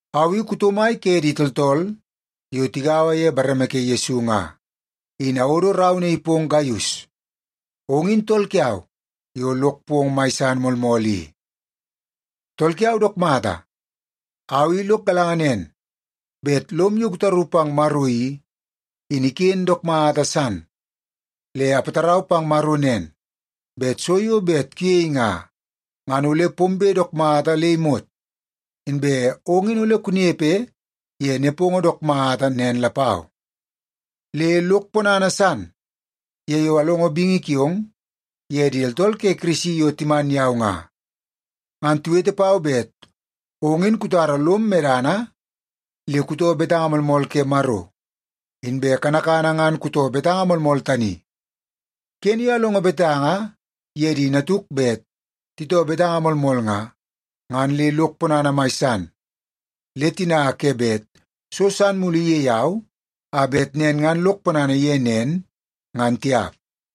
Au i kuto mai ke di tooltool yo tigaua ye bareme ke Yesu nga, in awodo rau naii pong Gaius. Ong in tool kiau yo lok pong mai san moolmool i. Tool kiau dook mata, au i lok galanga nen bet lom yo kutaru pang Maro i, in iken dook mata san. Le apatarau pang Maro nen bet so yo bet kuyei nga, ngan ole pombe dook mata le imot, inbe ong in ole kunepe ye nepongo dook mata nen lapau. Le lok ponana san ye yo alongo bingi kiong ye di tooltool ke Kirisi yo timan yau nga. Ngan tiwete pau bet ong in kutara lom medana le kutoo betanga moolmool ke Maro. Inbe kanakana ngan kutoo betanga moolmool tani. Kene yo alongo betanga ye di natuk bet titoo betanga moolmool nga, ngan le lok ponana mai san. Le tina ke bet so san mulu iyei au, a bet nen ngan lok ponana ye nen, ngan tiap.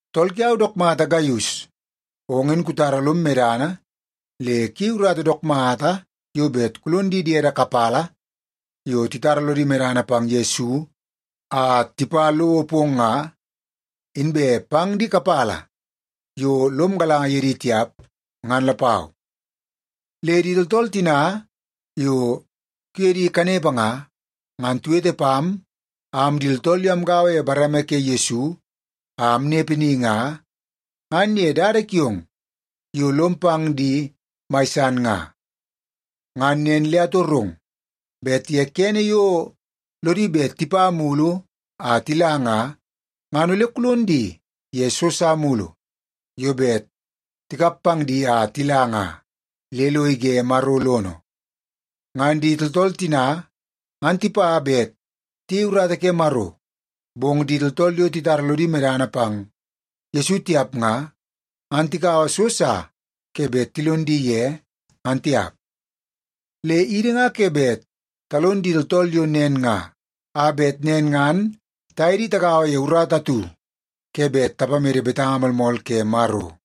Tool kiau dook mata Gaius, ong in kutara lom medana le kuyei urata dook mata yo bet kulon di diede kapala yo titara lodi medana pang Yesu a tipa lowo pong nga, inbe pang di kapala yo lom galanga ye di tiap, ngan lapau. Le di tooltool tina yo kuye di kanepe nga, ngan tiwete pam am di tooltool yo amgaua ye bareme ke Yesu a amnepe ni nga, ngan ye dada kiong yo lom pang di mai san nga. Ngan nen le atorong bet ye kene yo lodi bet tipa mulu a tila nga, ngan ole kulon di ye so sa mulu yo bet tikap pang di a tila nga, le lo ige Maro lono. Ngan di tooltool tina ngan tipa bet tiyei urata ke Maro, bong di tooltool yo titara lodi medana pang Yesu tiap nga, ngan tikaua so sa ke bet tilon di ye, ngan tiap. Le idi nga ke bet talon di tooltool yo nen nga, a bet nen ngan taye di tagaua ye urata atu ke bet tapamede betanga moolmool ke Maro.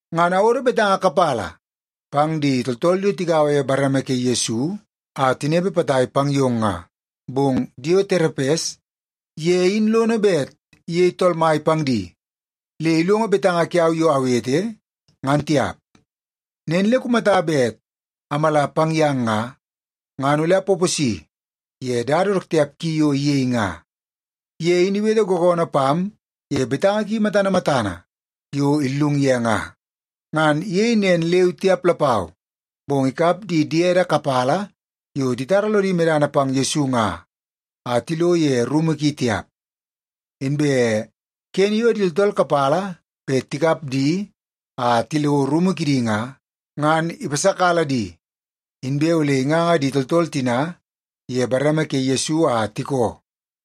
Ngan awodo betanga kapala pang di tooltool yo tigaua ye bareme ke Yesu a tinepe potai pang yong nga. Bong Dioterepes ye in lono bet iyei tool mai pang di le ilongo betanga kiau yo awete, ngan tiap. Nen le kumata bet amala pang yang nga, ngan ole apaposi ye dada dook tiap ki yo iyei nga. Ye in iwete googoonoo pam ye betanga ki matana matana yo illung ye nga. Ngan iyei nen leu tiap lapau, bong ikap di diede kapala yo titara lodi medana pang Yesu nga a tilo ye rumu ki tiap. Inbe kene yo di tooltool kapala bet tikap di a tilo rumu kidi nga, ngan ipasakala di, inbe ole inganga di tooltool tina ye bareme ke Yesu a tikoo.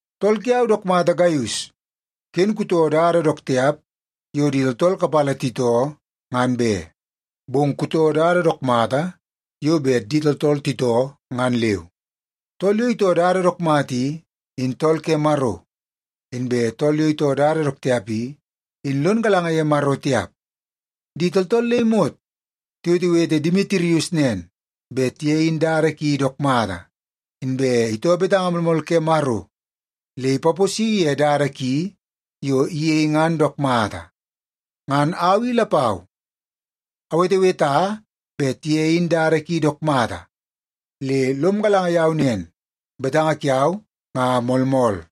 Tool kiau dook mata Gaius, ken kutoo dada dook tiap yo di tooltool kapala titoo, ngan be. Bong kutoo dada dook mata yo bet di tooltool titoo ngan leu. Tool yo itoo dada dook mata i, in tool ke Maro. Inbe tool yo itoo dada dook tiap i, in lon galanga ye Maro tiap. Di tooltool le imot tiwetewete Demitirius nen, bet ye in dada ki dook mata. Inbe itoo betanga moolmool ke Maro le ipaposi ye dada ki yo iyei ngan dook mata. Ngan au i lapau aweteweta bet ye in dada ki dook mata, le lom galanga yau nen, betanga kiau nga moolmool.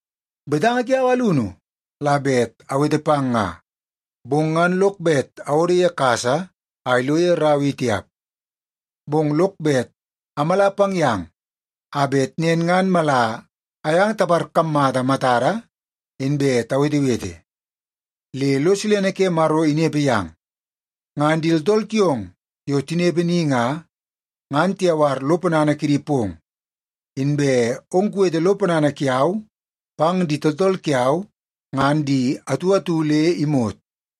Betanga kiau alunu la bet awete pang nga, bong ngan lok bet awodo ye kasa a ilo ye rau i tiap. Bong lok bet amala pang yang a bet nen ngan mala ayang taparkammata matada, inbe tawetewete. Le lo silene ke Maro inepe yang. Ngan di tooltool kiong yo tinepe ni nga, ngan tiyawar lo ponana kidi pong. Inbe ong kuwete lo ponana kiau pang di tooltool kiau ngan di atu atu le imot.